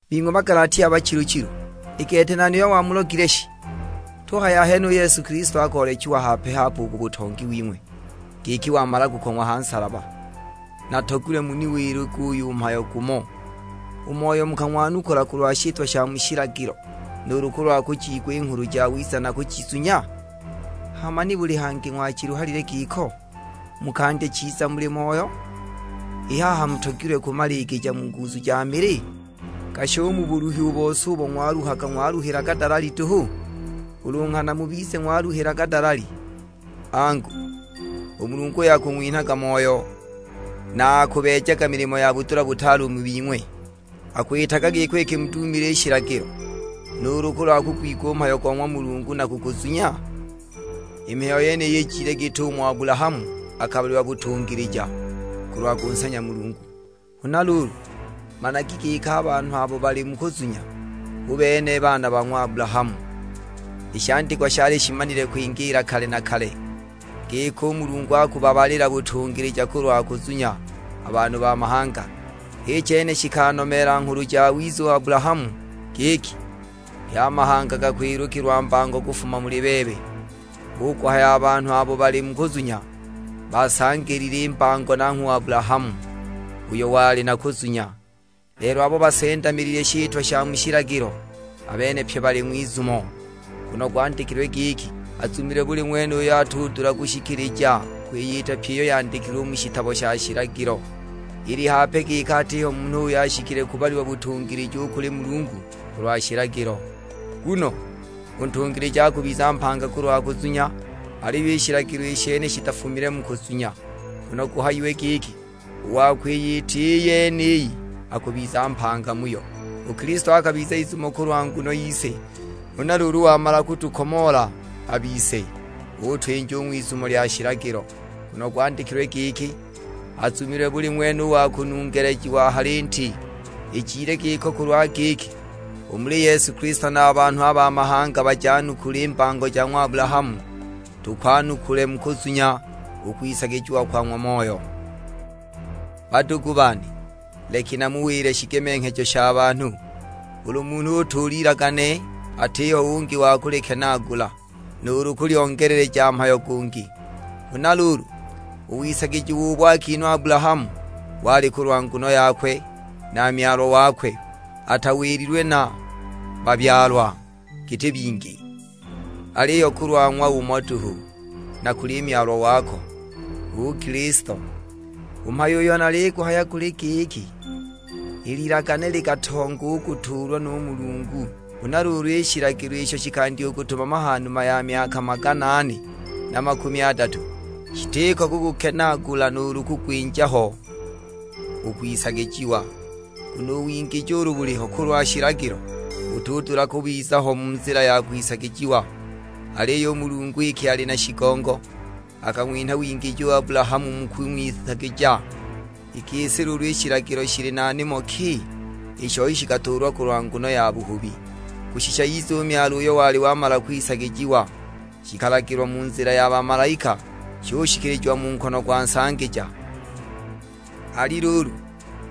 Bing'we Bagalatia bachilu-chilu, i gete nani uyo wamulogile shi? Tuhaya ahene u Yesu Kilisto akoolechiwa hape-hape u ku butongi wing'we, giki wamala kukong'wa ha nsalaba! Natogilwe muniwile guyu mhayo gumo, u Moyo mukang'wanukula kulwa shitwa sha mu shilagilo, nuulu kulwa kujiigwa i Nghulu Jawiza na kujizunya? Hama nibuli hangi ng'wachiluhalile giko? Mukandya chiza muli Moyo, i haha mutogilwe kumaligija mu nguzu ja mili? Gashi u mu buluhi u bose ubo ng'waluhaga, ng'waluhilaga dalali duhu? Ulu nghana mubize ng'waluhilaga dalali! Angu, u Mulungu uyo akung'winhaga Moyo, na akubeejaga milimo ya budula butaale mu bing'we, akwitaga giko iki mudimile shilagilo, nuulu kulwa kugwigwa u mhayo go ng'wa Mulungu na kuguzunya? I mihayo yeniyi ijile git'umo Abulahamu akabalilwa butungilija, kulwa kunsanya Mulungu. Huna luulu, managi giki a banhu abo bali mu kuzunya, hu bene a baana ba ng'wa Abulahamu. I shandikwa shali shimanile kwingiila kale na kale, giki u Mulungu akubabalila butungilija kulwa kuzunya a banhu ba mahanga, h'i chene shikanomeela Nghulu Jawiza u Abulahamu giki, "Pye a mahanga gakwilukilwa mbango kufuma muli bebe." Hu kuhaya a banhu abo bali mu kuzunya, basangilile i mbango nanghwe u Abulahamu, uyo wali na kuzunya. Lelo abo basendamilile shitwa sha mu shilagilo, a bene pye bali ng'wizumo; nguno gwandikilwe giki, "Azumilwe buli ng'wene uyo atudula kushikilija kwiyita pyi iyo yandikilwe mu shitabo sha shilagilo." Ili hape giki atiho munhu uyo ashikile kubalilwa butungilija u kuli Mulungu kulwa shilagilo; nguno, "U ntungilija akubiza mpanga kulwa kuzunya." Aliyo i shilagilo i shene shitafumile mu kuzunya, nguno guhayiwe giki, "U wa kwiyita i yeniyi akubiza mpanga muyo." U Kilisto akabiza izumo kulwa nguno yise, huna luulu wamala kutukomoola a bise, utwinja u ng'wizumo lya shilagilo, nguno gwandikilwe giki, "Azumilwe buli ng'wene u wa kunungelejiwa ha linti." Ijile giko kulwa giki, u muli Yesu Kilisto na a banhu ba mahanga bajanukule i mbango ja ng'wa Abulahamu, tukwanukule mu kuzunya u kwisagijiwa kwa ng'wa Moyo. Badugu bane, leki namuwile shigemenghejo sha banhu; ulu munhu utuula ilagane atiho ungi wa kulikenaagula, nuulu kulyongeleleja mhayo gungi. Huna luulu, u wisagijiwa ubo akinhwa u Abulahamu wali kulwa nguno yakwe na Myalwa wakwe. Atawililwe na "Babyalwa", giti bingi. Aliyo kulwa ng'wa umo duhu: "Na kuli Myalwa wako," hu Kilisto. U mhayo uyo naliguhaya guli giki, i lilagane likatonga u kutuulwa nu Mulungu, huna luulu i shilagilo isho shikandya kutumama ha numa ya myaka magana ane na makumi adatu, shitiko kugukenaagula nuulu kugwinja ho u kwisagijiwa. Nguno u wingiji ulu buliho kulwa shilagilo, butudula kubiza ho mu nzila ya kwisagijiwa; aliyo u Mulungu iki ali na shigongo, akang'winha wingiji u Abulahamu mu kung'wisagija. I gisi luulu i shilagilo shili na nimo ki? I shoi shikatuulwa kulwa nguno ya buhubi, kushisha ize u Myalwa uyo wali wamala kwisagijiwa. Shikalagilwa mu nzila ya bamalaika, shushikilijiwa mu nkono gwa nsangija. Ali luulu,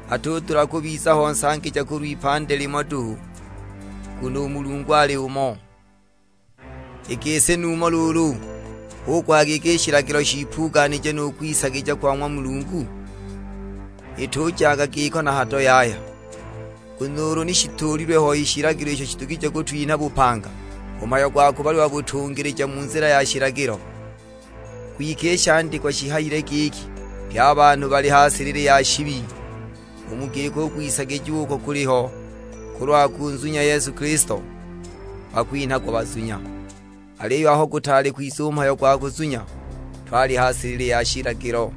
atudula kubiza ho nsangija kulw'ipandi limo duhu, nguno u Mulungu ali umo. I gisi numho luulu hu kuhaya i shilagilo shiipuganije nu kwisagija kwa ng'wa Mulungu? Itujaga giko na hado yaya! Nguno ulu ni shituulilwe ho shilagilo isho shidugije kutwinha bupanga, u mhayo gwa kubalilwa butungilija mu nzila ya shilagilo ni guliho. Kwike i shandikwa shihayile giki, pye a banhu bali ha silili ya shibi. U mu giko u kwisagijiwa uko kuliho kulwa kunzunya Yesu Kilisto, bakwinhagwa bazunya. Aliyo aho gutaali kwiza u mhayo gwa kuzunya, twali ha silili ya shilagilo,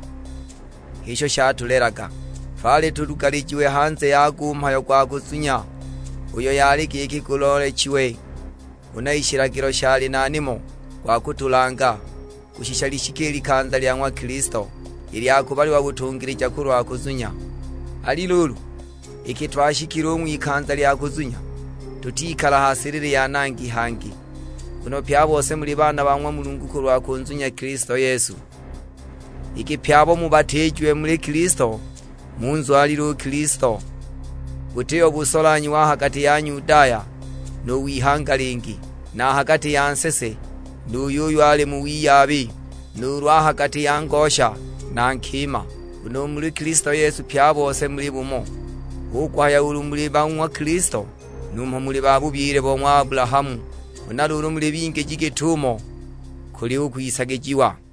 h'isho shatulelaga. Twali tulugalijiwe hanze yago u mhayo gwa kuzunya, uyo yali giki guloolechiwe. Huna i shilagilo shali na nimo gwa kutulanga, kushisha lishike i likanza lya ng'wa Kilisto, i lya kubalilwa butungilija kulwa kuzunya. Ali luulu, iki twashikile u ng'wikanza lya kuzunya, tutikala ha silili ya nangi hangi. Nguno pye a bose muli baana ba ng'wa Mulungu kulwa kunzunya Kilisto Yesu. Iki pye abo mubatiijiwe muli Kilisto, munzwalile u Kilisto. Butiho busolanhyiwa a ha gati ya Nyudaya nu w'ihanga lingi, na a ha gati ya nsese nu yuyo ali mu wiyabi, nuulu a ha gati ya ngosha na nkima; nguno u muli Kilisto Yesu pye a bose muli bumo. Hu kuhaya ulu muli ba ng'wa Kilisto, numho muli ba bubyile bo ng'wa Abulahamu, huna luulu muli bingiji git'umo kuli u kwisagijiwa.